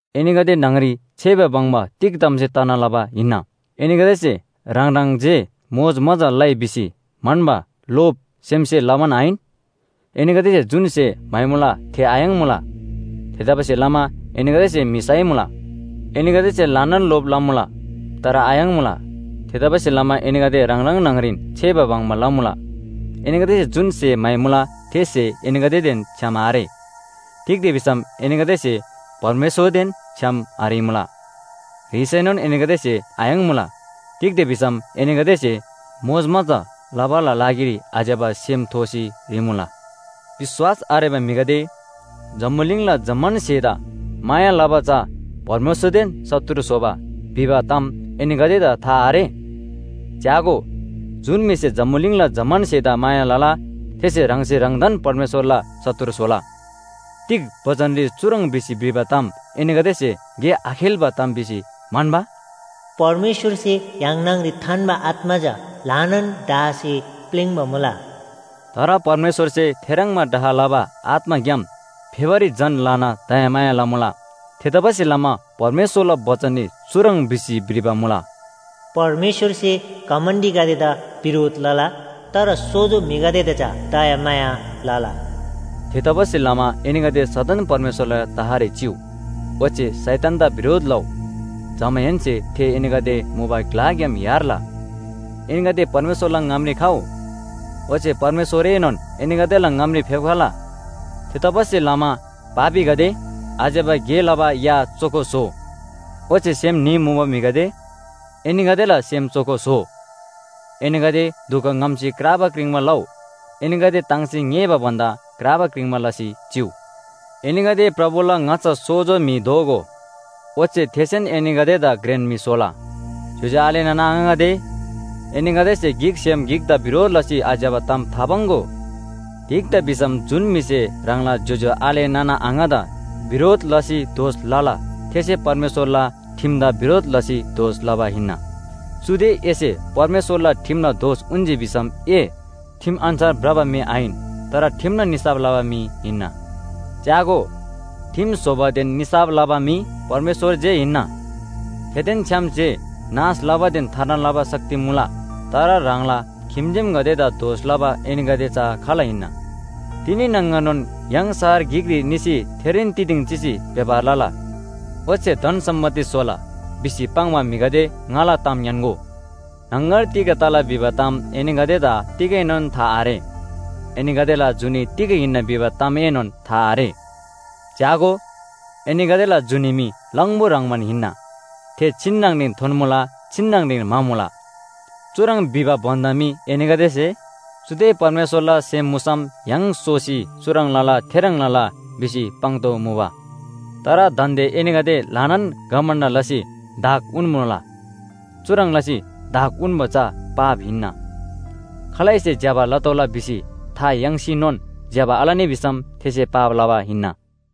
एनीगदे न्‍हङरी छेबा बङ्बा तिग तामसे तना लबा हिन्‍ना? एनीगदेसे ह्राङ ह्राङ जे मोजमजा लइ भिसी म्‍हन्‍बा लोभ सेमसे लमान आहिन? एनीगदेसे जुन स्‍हे म्‍हाइमुला थे आयाङ्मुला। थेतबासेलमा एनीगदेसे म्‍हि साइमुला। एनीगदेसे ल्‍हानान लोभ लमुला, तर आयाङ्मुला। थेतबासेलमा एनीगदे ह्राङ ह्राङ न्‍हङरीन छेबा बङ्बा लमुला। एनीगदेसे जुन स्‍हे म्‍हाइमुला थे स्‍हे एनीगदेदेन छ्‌याम आरे। तिग्‍दा भिसम एनीगदेसे परमेश्‍वरदेन छ्‌याम आह्रीमुला। ह्रीसैनोन एनीगदेसे आयाङ्मुला। तिग्‍दा भिसम एनीगदेसे मोजमजा लबाला लागिरी आज्‍यबा सेम थोसी ह्रीमुला। विश्‍वास आरेबा म्‍हिगदे, जम्‍बुलिङला जम्‍मान स्‍हेदा माया लबा चा परमेश्‍वरदेन शत्रु स्‍होबा भिबा ताम एनीगदेदा था आरे? च्‍यागो, जुन म्‍हिसे जम्‍बुलिङला जम्‍मान स्‍हेदा माया लला थेसे ह्राङसे ह्राङदान परमेश्‍वरला शत्रु स्‍होला। तिग बचनरी चुह्रङ् भिसी भ्रिबा ताम एनीगदेसे गे आखेल्‍बा ताम भिसी म्‍हन्‍बा? “परमेश्‍वरसे य्‍हाङ न्‍हङरी थान्‍बा आत्‍मा चा ल्‍हानान डाहसे प्‍लिङ्बा मुला।” तर परमेश्‍वरसे थेह्रङ्बा डाह लबा आत्‍माग्‍याम फेबारी झन ल्‍हाना दयामाया लमुला। थेतबासेलमा परमेश्‍वरला बचनरी चुह्रङ् भिसी भ्रिबा मुला, “परमेश्‍वरसे घमण्‍डीगदेदा बिरोध लला, तर सोजो म्‍हिगदेदा चा दयामाया लला।” थेतबासेलमा एनीगदे सदन परमेश्‍वरला तहरी चिउ, ओच्‍छे शैतानदा बिरोध लउ। जमाहेन्‍से थे एनीगदे मुबा ग्‍लाग्‍याम यार्ला। एनीगदे परमेश्‍वरला ङामरी खउ, ओच्‍छे परमेश्‍वरएनोन एनीगदेला ङामरी फेप्‍खला। थेतबासेलमा पापीगदे, आज्‍यबा गे लबा या चोखो स्‍होउ। ओच्‍छे सेम न्‍ही मुबा म्‍हिगदे, एनीगदेला सेम चोखो स्‍होउ। एनीगदे दुख ङ्‍हम्‍सी क्राबा क्रिङ्बा लउ। एनीगदे ताङ्सी ङ्‍येःबा भन्‍दा क्राबा क्रिङ्बा लसी चिउ। एनीगदे प्रभुला ङाच्‍छा सोजो म्‍हि दोगो, ओच्‍छे थेसेन एनीगदेदा घ्रेन म्‍हि स्‍होला। ज्‍योज्‍यो आले नाना आङागदे, एनीगदेसे गिकसेम गिकदा बिरोध लसी आज्‍यबा ताम थापाङ्‍गो। तिग्‍दा भिसम जुन म्‍हिसे ह्राङला ज्‍योज्‍यो आले नाना आङादा बिरोध लसी दोष लला थेसे परमेश्‍वरला ठिमदा बिरोध लसी दोष लबा हिन्‍ना। चुदे एसे परमेश्‍वरला ठिमला दोष उन्‍जी भिसम ए ठिम अन्‍छार भ्रबा म्‍हि आहिन। तर ठिमला निसाफ लबा म्‍हि हिन्‍ना। च्‍यागो, ठिम स्‍होबादेन निसाफ लबा मी परमेश्‍वर जे हिन्‍ना। थेदेन छ्‌याम जे नाश लबादेन थार्ना लबा शक्ति मुला। तर ह्राङला खिम्‍जेमगदेदा दोष लबा एनीगदे चा खाल हिन्‍ना? “तिनी न्‍हङगरनोन य्‍हाङ शहर गिकरी निसी थेरीन तिदिङ चिसी व्‍यापार लला। ओच्‍छे धन सम्‍पत्ति स्‍होला” भिसी पाङ्बा म्‍हिगदे ङाला ताम ङ्‌यान्‍गो। न्‍हङगर तिग तला भिबा ताम एनीगदेदा तिगैनोन था आरे। एनीगदेला जुनी तिग हिन्‍ना भिबा तामएनोन था आरे। च्‍यागो, एनीगदेला जुनी मी लङबु ह्रङ्‌बान हिन्‍ना। थे छिन्‍नङरीन थोन्‍मुला छिन्‍नङरीन म्‍हामुला। चुह्रङ् भिबा भन्‍दा मी एनीगदेसे “चुदे परमेश्‍वरला सेम मुसम य्‍हाङ सोसी चुह्रङ् लला थेह्रङ् लला” भिसी पाङ्तोःमुबा। तर दान्‍दे एनीगदे ल्‍हानान घमण्‍ड लसी धाक उन्‍मुला। चुह्रङ् लसी धाक उन्‍बा चा पाप हिन्‍ना। खालैसे ज्‍यबा लतोःला भिसी था याङ्सीनोन ज्‍यबा आलनी भिसम थेसे पाप लबा हिन्‍ना।